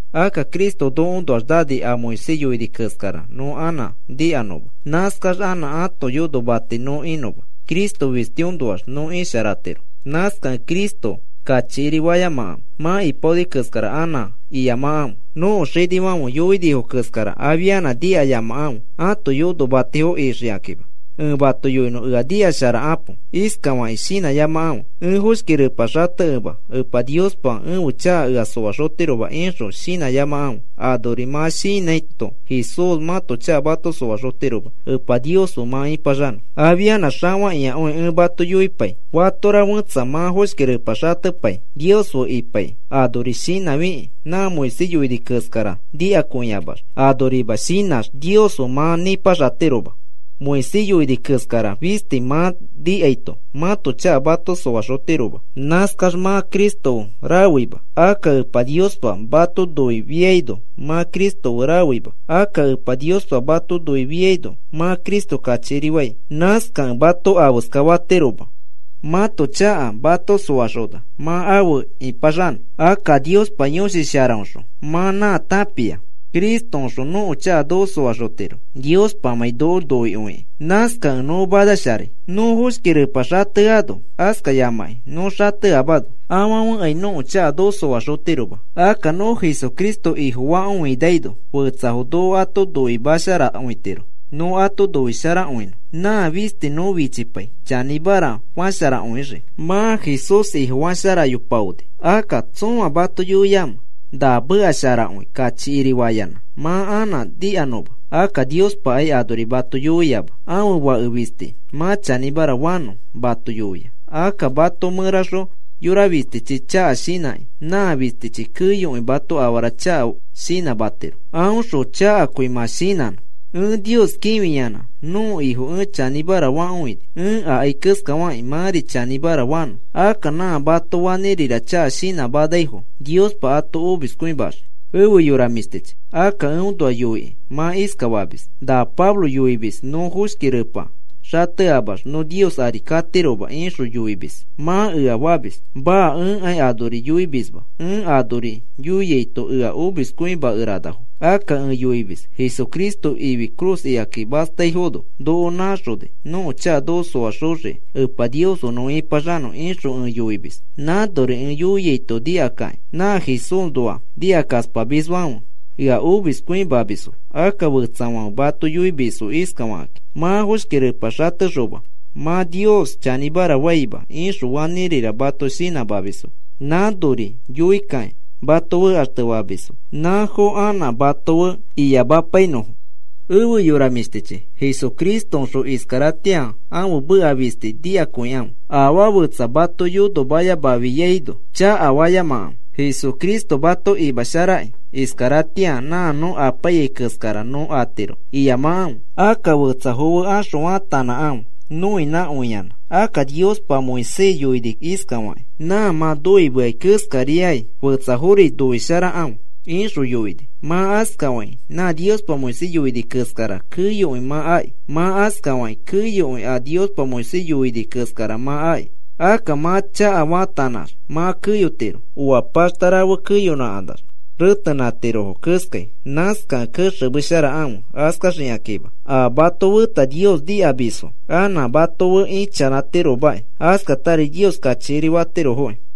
Akka Cristo nokoõnoax nani a Moisés yoini keskara nõ anã nikanõma, nãskax anã ãto yonomati nõ inõma. Cristo fistiõnoax nõ isharatiro, nãskakẽ Cristo kachikiri fayamakãfe. Mã ipaoni keskara anã iyamakãfe, nõko xinifãfe yoinifo keskara afianã nikayamakãfe ãto yonomatifo ixikakĩma. Ẽ mato yoinõ, ea nikasharakapo. Iskafakĩ shinãyamakãfe: “Ẽ foshki repa xatekema Epa Niospa ẽfe chaka ea soaxotiroma,” ixõ shinãyamakãfe. Anori mã shinãito Jesús mãto chaka mato soaxotiroma Epa Nios fe mã ipaxanõ. Afianã xafakĩakõi ẽ mato yoipai. Fatora fẽtsa mã foshki repa xatepai Nios fe ipaikĩ, anori shinãfikĩ nã Moisés yoini keskara nikakõiamax, anorima shinãx Nios fe mã nipaxatiroma. Moisés yoini keskara fisti mã nikaito mãto chaka mato soaxotiroma. Nãskax mã Cristo fe rafeima, akka Epa Niospa mato noifiaino mã Cristo fe rafeima, akka Epa Niospa mato noifiaino mã Cristo kachikirifai. Nãskafekẽ mato afeska fatiroma mãto chaka mato soaxona mã afe ipaxanõ. Akka Niospa Yõshi Sharaõxõ mã nã tãpia, Cristoõxõ nõko chaka noko xoaxotiro Niospamãi noko noikõikĩ. Nãskakẽ nõ manasharai. Nõ foshki repa xateano, askayamãkĩ nõ xateamano, afãfekai nõko chaka noko soaxotiroma. Akka nõ Jesucristo Ifofakõinaino fetsafo noko ato noimasharakõitiro nõ ato noisharakõinõ. Nã fisti nõ fichipai, chanĩmara fasharakõixii. Mã Jesús Ifofasharayopaoni. Akka, ¿tsõa mato yoiamẽ, na meka sharakõi kachikirifayanã mã anã nikanõma? Akka Niospakai anori mato yoiama. Ãfe Fake fisti mã chanĩmara fanõ mato yoia. Akka mato mẽraxõ yora fistichi chaka shinãkĩ, nã fistichi keyokõi mato afara chaka shinãmatiro, aõxõ chakakõi mã shinãno. Ẽ Nios kĩfiyanã nõko Ifo ẽ chanĩmara fakõini, ẽ akai keskafakĩ mãri chanĩmara fanõ. Akka nã mato fanĩrira chaka shinãmanaifo Niospa ato omiskõimaxii. Efe yora mĩshtichi, akka eõnoa yoikĩ mã iskafamis: “Na Pablo yoimis nõ foshki repa xateamax nõ Nios ari katiroma ixõ yoimis,” mã ea famis. Maa, ẽkai anori yoimisma, ẽ anori yoiaito ea omiskõimakeranafo. Akka ẽ yoimis: “Jesucristo ifi cruz ikaki mastaifono noko nãxoni, nõko chaka noko soaxoxii Epa Nios fe nõ ipaxanõ,” ixõ ẽ yoimis. Nãnori ẽ yoiaito nikakĩ nã Jesúsnoa nikakaspamisfãfe ea omiskõimamisfo. Akka fetsafãfe mato yoimisfo iskafakakĩ: “Mã foshki repa xatexoma mã Nios chanĩmara faima,” ixõ fanĩrira mato shinãmamisfo. Nãnori yoikakĩ mato fekaxtefamisfo, nãfo anã mato fe iyamapainõfo. Efe yora mĩshtichi, Jesucristoõxõ iskaratĩa ãfe meka fisti nikakõikãfe. Afaa fetsa mato yonomayamafiaino chakafayamakãfe. Jesucristo mato imasharakĩ iskaratĩa nã nõ apaiyai keskara nõ atiro iyamakãfe. Akka fetsafo fe axõ faatanãkãfe noinãkõiyanã. Akka Niospa Moisés yoini iskafakĩ: “Nã mã noimeai keskariakĩ fetsafori noisharakãfe,” ixõ yoini. Mã askafakĩ nã Niospa Moisés yoini keskara, keyokõi mã aki. Mã askafakĩ keyokõi a Niospa Moisés yoini keskara mã aki. Akka mã chakafaatanax mã keyotiro, oa paxta rafe keyonãkanax retenãtirofo keskai. Nãskakẽ kexemesharakãfe askaxikakĩma, a mato feta Nios nikamisfo anã mato fe ichanãtirofomaki. Askatari Nios kachikiri fatirofoki.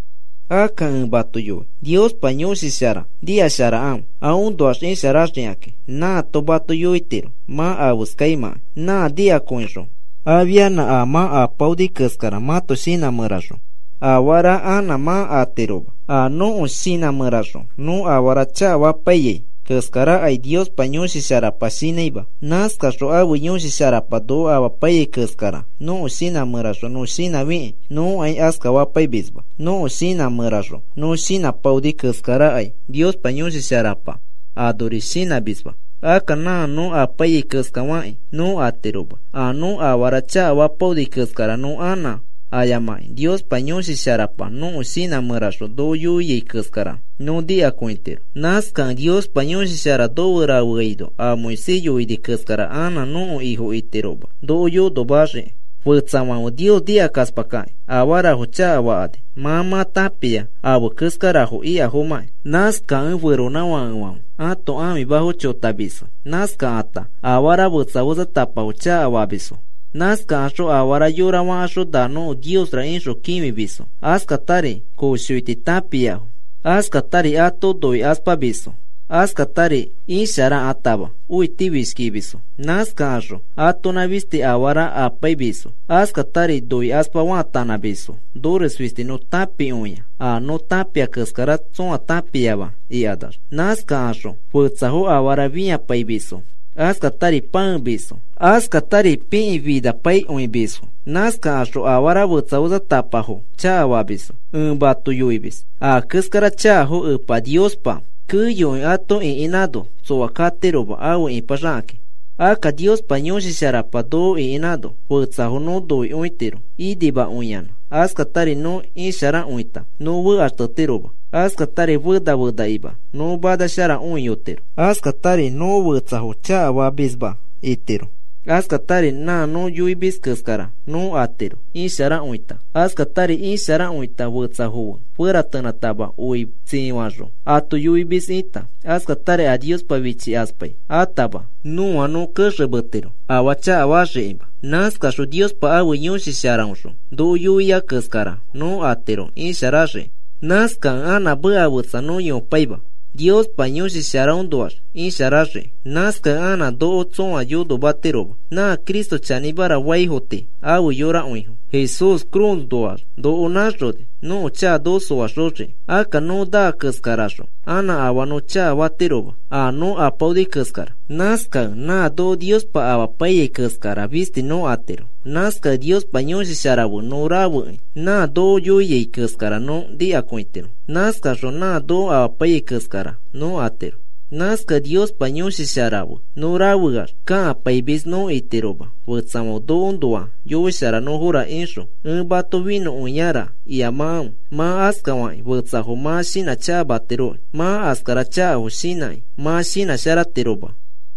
Akka ẽ mato yoi Niospa Yõshi Shara nikasharakãfe aõnoax isharaxikaki. Nãato mato yoitiro mã afeskaimãkai. Nã nikakõixõ afianã a mã apaoni keskara mãto shinã mẽraxõ afara anã mã atiroma. A nõko shinã mẽraxõ nõ afara chakafapaiyai keskarakai Niospa Yõshi Sharapa shinãima. Nãskaxõ ãfe Yõshi Sharapa noko amapaiyai keskara nõko shinã mẽraxõ nõ shinãfikĩ nõkai askafapaimisma. Nõko shinã mẽraxõ nõ shinãpaoni keskarakai Niospa Yõshi Sharapa anori shinãmisma. Akka nã nõ apaiyai keskafakĩ nõ atiroma. A nõ afara chakafapaoni keskara nõ anã ayamakĩ Niospa Yõshi Sharapa nõko shinã mẽraxõ noko yoiai keskara nõ nikakõitiro. Nãskakẽ Niospa Yõshi Shara nofe rafeaino a Moisés yoini keskara anã nõko ifo itiroma noko yonomaxiki. Fetsafãfe Nios nikakaspakakĩ afarafo chakafakani. Mã mã tãpia afe keskarafo ikafomãki. Nãskakẽ feronãfakefãfe ãto ãfimafo chotamisfo. Nãskakata afara fetsa fetsatapafo chakafamisfo. Nãskakaxõ afara yora fakaxõ na nõko niosra ixõ kĩfimisfo. Askatari koshoiti tãpiafo, askatari ato noikaspamisfo, askatari isharakãtama õitifishkimisfo. Nãskakaxõ atonã fisti afara apaimisfo, askatari noikaspa faatanãmisfo nores fisti nõ tãpikõia a nõ tãpia keskara tsõa tãpiama ikanax. Nãskaxõ fetsafo afara fĩapaimisfo, askatari pãemisfo, askatari pikĩfinapaikõimisfo. Nãskakaxõ afara fetsa fetsatapafo chakafamisfo. Ẽ mato yoimis a keskara chakafo Epa Niospa keyokõi ato ĩkinã ano tsoa katiroma afe ipaxakakĩ. Akka Niospa Yõshi Sharapa noko ĩkinãno fetsafo nõ noikõitiro inimakõiyanã, askatari nõ isharakõita nõ fekaxtetiroma, askatari fena fenakima nõ manasharakõiyotiro, askatari nõ fetsafo chakafamisma itiro, askatari nã nõ yoimis keskara nõ atiro isharakõita. Askatari isharakõita, fetsafo fe feratenãtama oi tsifaxõ ato yoimis ita, askatari a Niospa fichikaspai atama nõa nõ kexemetiro afaa chakafaxikima. Nãskaxõ Niospa ãfe Yõshi Sharaõxõ noko yoia keskara nõ atiro isharaxiki. Nãskakẽ anã meka fetsa nõ yoipaima Niospa Yõshi Sharaõnoax isharaxiki. Nãskakẽ anã noko tsõa yonomatiroma. Nã Cristo chanĩmara faifo tii afe yorakõifo. Jesús cruznoax noko nãxoni nõko chaka noko soaxoxiki. Akka nõ naa keskaraxõ anã afaa nõ chakafatiroma a nõ apaoni keskara. Nãskakẽ nã noko Niospa amapaiyai keskara fisti nõ atiro. Nãskakẽ Niospa Yõshi Shara fe nõ rafekĩ nã noko yoiai keskara nõ nikakõitiro. Nãskaxõ nã noko amapaiyai keskara nõ atiro. Nãskakẽ Niospa Yõshi Shara fe nõ rafeax kakapaimis nõ itiroma, fetsafãfe nokoõnoa yoisharanõfora ixõ ẽ mato finõkõiara iyamakãfe. Mã askakĩ fetsafo mã shinãchakamatiroki. Mã askara chakafo shinãkĩ mã shinãsharatiroma,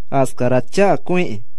askara chakakõiki.